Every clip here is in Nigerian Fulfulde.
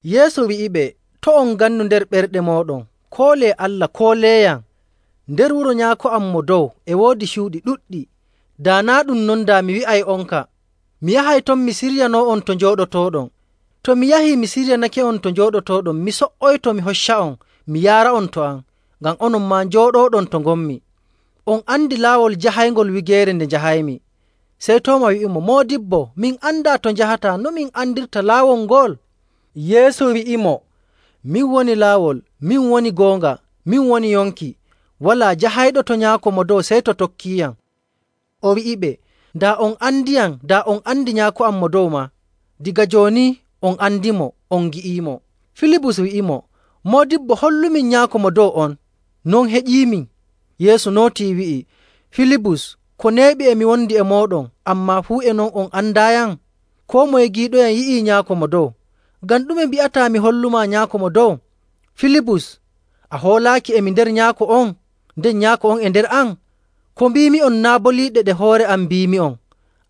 Yeesu wi'iɓe, “To' on ngannu nder ɓerɗe mooɗon, koolee Allah, kooleeyam. Nder wuro Nyaako am Mo Dow e woodi cuuɗi ɗuɗɗi. Daa naa' ɗum non, daa mi wi'ay'onka. Mi yahay ton mi siryanoo'on to njooɗotooɗon. To mi yahii, mi siryanake'on to njooɗotooɗon, mi so''oyto, mi hocca'on mi yaara'on to am, ngam onon maa njooɗooɗon to ngonmi. On andi laawol jahayngol wigeere nde njahaymi.” Sey Tooma wi'imo, “Moodibbo, min andaa to njahataa, no min andirta laawol ngol?” Yeesu wi'imo, “Min woni laawol, min woni goonga, min woni yonki. Walaa jahayɗo to Nyaako Mo Dow sey to tokkiiyam.” O wi'iɓe, “Daa on andiyam, daa on andi Nyaako am Mo Dow maa. Daga jooni on andimo on ngi'iimo.” Filibus wi'imo, “Moodibbo, hollumin Nyaako Mo Dow on, non heƴiimin.” Yeesu nootii wi'i, “Filibus, ko neeɓi e mi wondi e mooɗon, ammaa fuu e non a andaayam? Koo moye giiɗoyam yi'ii Nyaako Mo Dow. Ngam ɗume mbi'ataa mi holla'on Nyaako Mo Dow? Filibus, a hoolaaki e mi nder Nyaako on, nden Nyaako on e nder am? Ko mbiimi'on naa' boliiɗe ɗe hoore am mbiimi'on,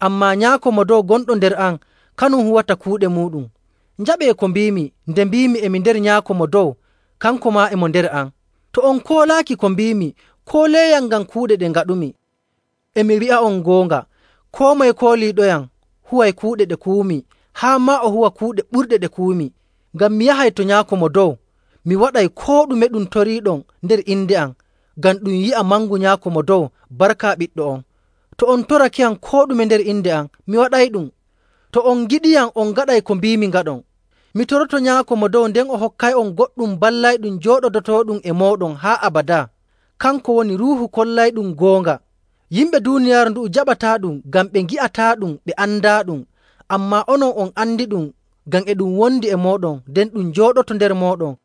ammaa Nyaako Mo Dow, gonɗo nder am, kanum huwata kuuɗe muuɗum. Njaɓee ko mbiimi nde mbiimi e mi nder Nyaako Mo Dow, kanko maa e mo nder am. To on koolaaki ko mbiimi, kooleeyam ngam kuuɗe ɗe ngaɗumi. E mi wi'a'on goonga, koo moye kooliiɗoyam huway kuuɗe ɗe kuwumi, haa maa o huwa kuuɗe ɓurɗe ɗe kuwumi, ngam mi yahay to Nyaako Mo Dow. Mi waɗay koo ɗume ɗum toriiɗon nder inde am, ngam ɗum yi'a mangu Nyaako Mo Dow barka Ɓiɗɗo on. To on torakeyam koo ɗume nder inde am, mi waɗayɗum. “To on ngiɗiyam, on ngaɗay ko mbiimi ngaɗon. Mi toroto Nyaako Mo Dow, nden o hokkay'on goɗɗum Ballayɗum, jooɗodotooɗum e mooɗon haa abadaa. Kanko woni Ruuhu kollayɗum goonga. Yimɓe duuniyaaru ndu'u njaɓataaɗum, ngam ɓe ngi'ataaɗum, ɓe andaaɗum. Ammaa onon on andiɗum ngam e ɗum wondi e mooɗon, nden ɗum jooɗoto nder mooɗon.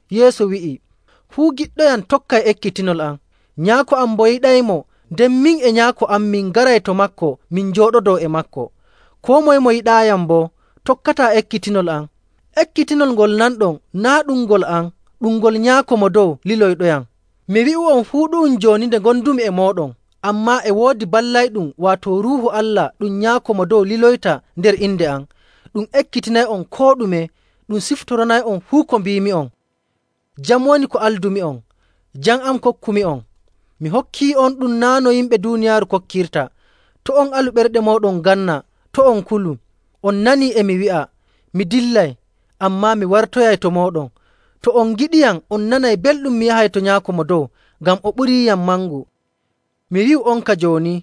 Yeesu wi'i, “Fuu giɗɗoyam tokkay ekkitinol am. Nyaako am boo yiɗaymo, nden min e Nyaako am min ngaray to maako min jooɗodoo e maako. Koo moye mo yiɗaayam boo tokkataa ekkitinol am. Ekkitinol ngol nanɗon, naa' ɗum ngol am, ɗum ngol Nyaako Mo Dow liloyɗoyam. “Mi wi'u'on fuu ɗu'um jooni nde ngondumi e mooɗon. Ammaa e woodi Ballayɗum, waato Ruuhu Allah ɗum Nyaako Mo Dow liloyta nder inde am. Ɗum ekkitinay'on koo ɗume, ɗum siftoranay'on fuu ko mbiimi'on. “Jam woni ko aldumi'on, jam am kokkumi'on. Mi hokkii'onɗum naa' no yimɓe duuniyaaru kokkirta. To' on alu ɓerɗe mooɗon nganna, to' on kulu. On nanii e mi wi'a, ‘Mi dillay, ammaa mi wartoyay to mooɗon.’ To on ngiɗiyam, on nanay belɗum mi yahay to Nyaako Mo Dow, ngam o ɓuriiyam mangu. Mi wi'u'onka jooni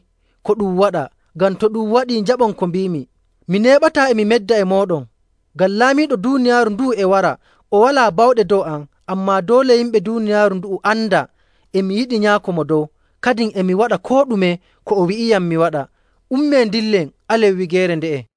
ko ɗum waɗa, ngam to ɗum waɗii njaɓon ko mbiimi. Mi neeɓataa e mi medda e mooɗon, ngam laamiiɗo duuniyaaru ndu'u e wara. O walaa bawɗe dow am. Ammaa doole yimɓe duuniyaaru ndu'u anda e mi yiɗi Nyaako Mo Dow, kadin e mi waɗa koo ɗume ko o wi'iyam mi waɗa. Ummee ndillen, alen wigeere nde'e.”